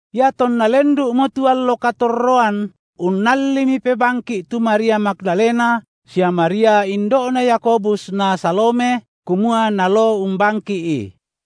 Iatonna lendu’mo tu allo katorroan unnallimi pebangki’ tu Maria Magdalena sia Maria indo’na Yakobus na Salome, kumua naloo umbangki’I.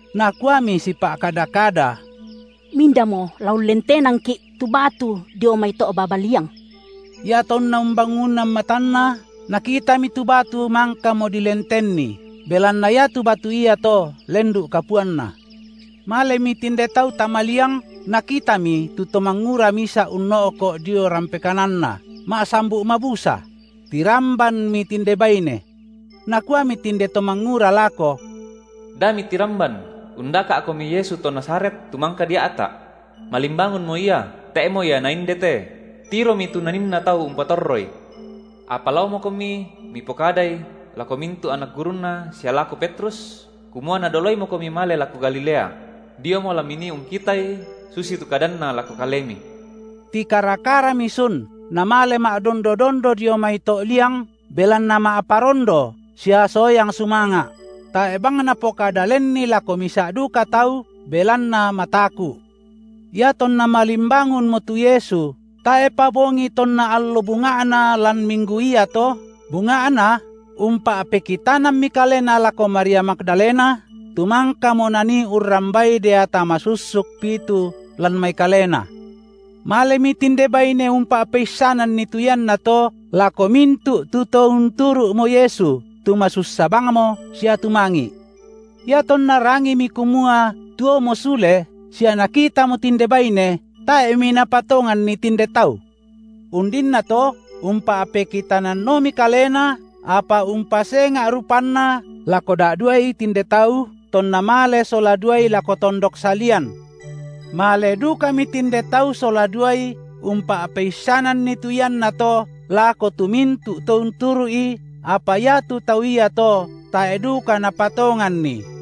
Nakuami sipa’kada-kada: Mindamo la ullentenangki’ tu batu dio mai to’ baba liang? Iatonna umbangunan matanna, nakitami tu batu mangkamo dilentenni –, belanna iatu batu iato lendu’ kapuanna. Malemi tinde tau tama liang, nakitami tu to mangura misa’ unno’ko’ dio rampe kananna, ma’sambu’ mabusa; tirambanmi tinde baine. Nakuami tinde to mangura lako: Da mitiramban; undaka’komi Yesu to Nazaret, tu mangka dia’ta’. Malimbangunmo Ia, tae’mo Ia naindete; tiromi tu naninna tau umpatorroI. Apa laomokomi, mipokadai, lako mintu’ anak gurunNa sia lako Petrus, kumua Nadoloimokomi male lako Galilea; diomo la minii ungkitaI susitu kadanNa lako kalemi. Tikara-karami sun namale ma’dondo-dondo dio mai to’ liang, belanna ma’parondo sia soyang sumanga’; tae’ bang napokada lenni lako misa’ duka tau, belanna mataku’. Iatonna malimbangunmo tu Yesu tae’pa bongi tonna allo bunga’na lan minggu iato, bunga’na umpa’pekitanammi Kalena lako Maria Magdalena, tu mangkamo Nanii urrambai deata masussuk pitu lan mai kalena. Malemi tinde baine umpa’peissananni tu iannato lako mintu’ tu to unturu’mo Yesu, tu masussa bangmo sia tumangi’. Iatonna rangimi kumua tuomo sule, sia nakitamo tinde baine, tae’mi napatonganni tinde tau. Undinnato umpa’pekitananomi Kalena, apa umpasenga’ rupanNa, lako da’duai tinde tau, tonna male sola duai lako tondok salian. Male dukami tinde tau sola duai umpa’peissananni tu iannato lako tu mintu’ to unturu’I, apa iatu tau iato tae’ duka napatonganni.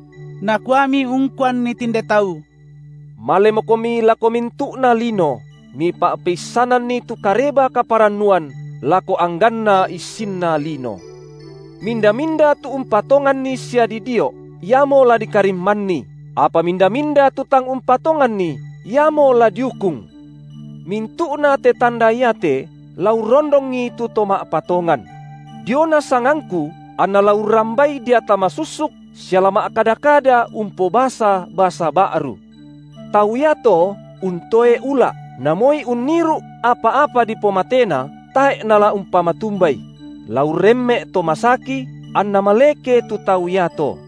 Nakuami ungkuanni tinde tau: Malemokomi lako mintu’na lino, mipa’peissananni tu Kareba-kaparannuan lako angganna issinna lino. Minda-minda tu umpatonganni sia didio’, iamo la dikarimmanni, apa minda-minda tu tang umpatonganni, iamo la diukung. Mintu’nate tanda iate la urrondongi tu to ma’patongan: diona sangangKu anna la urrambai deata masussuk sia la ma’kada-kada umpobasa basa ba’ru; tau iato untoe ula’, na moi unniru’ apa-apa dipomatena, tae’ nala umpatumbai; la urremme’ to masaki, anna maleke tu tau iato.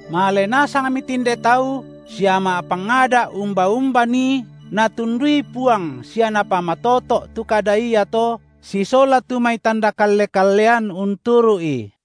Male nasangmi tinde tau sia ma’pangada’ umba-umba nii, Natundui Puang sia Napamatoto’ tu kada iato sisola tu mai tanda kalle-kallean unturu’i.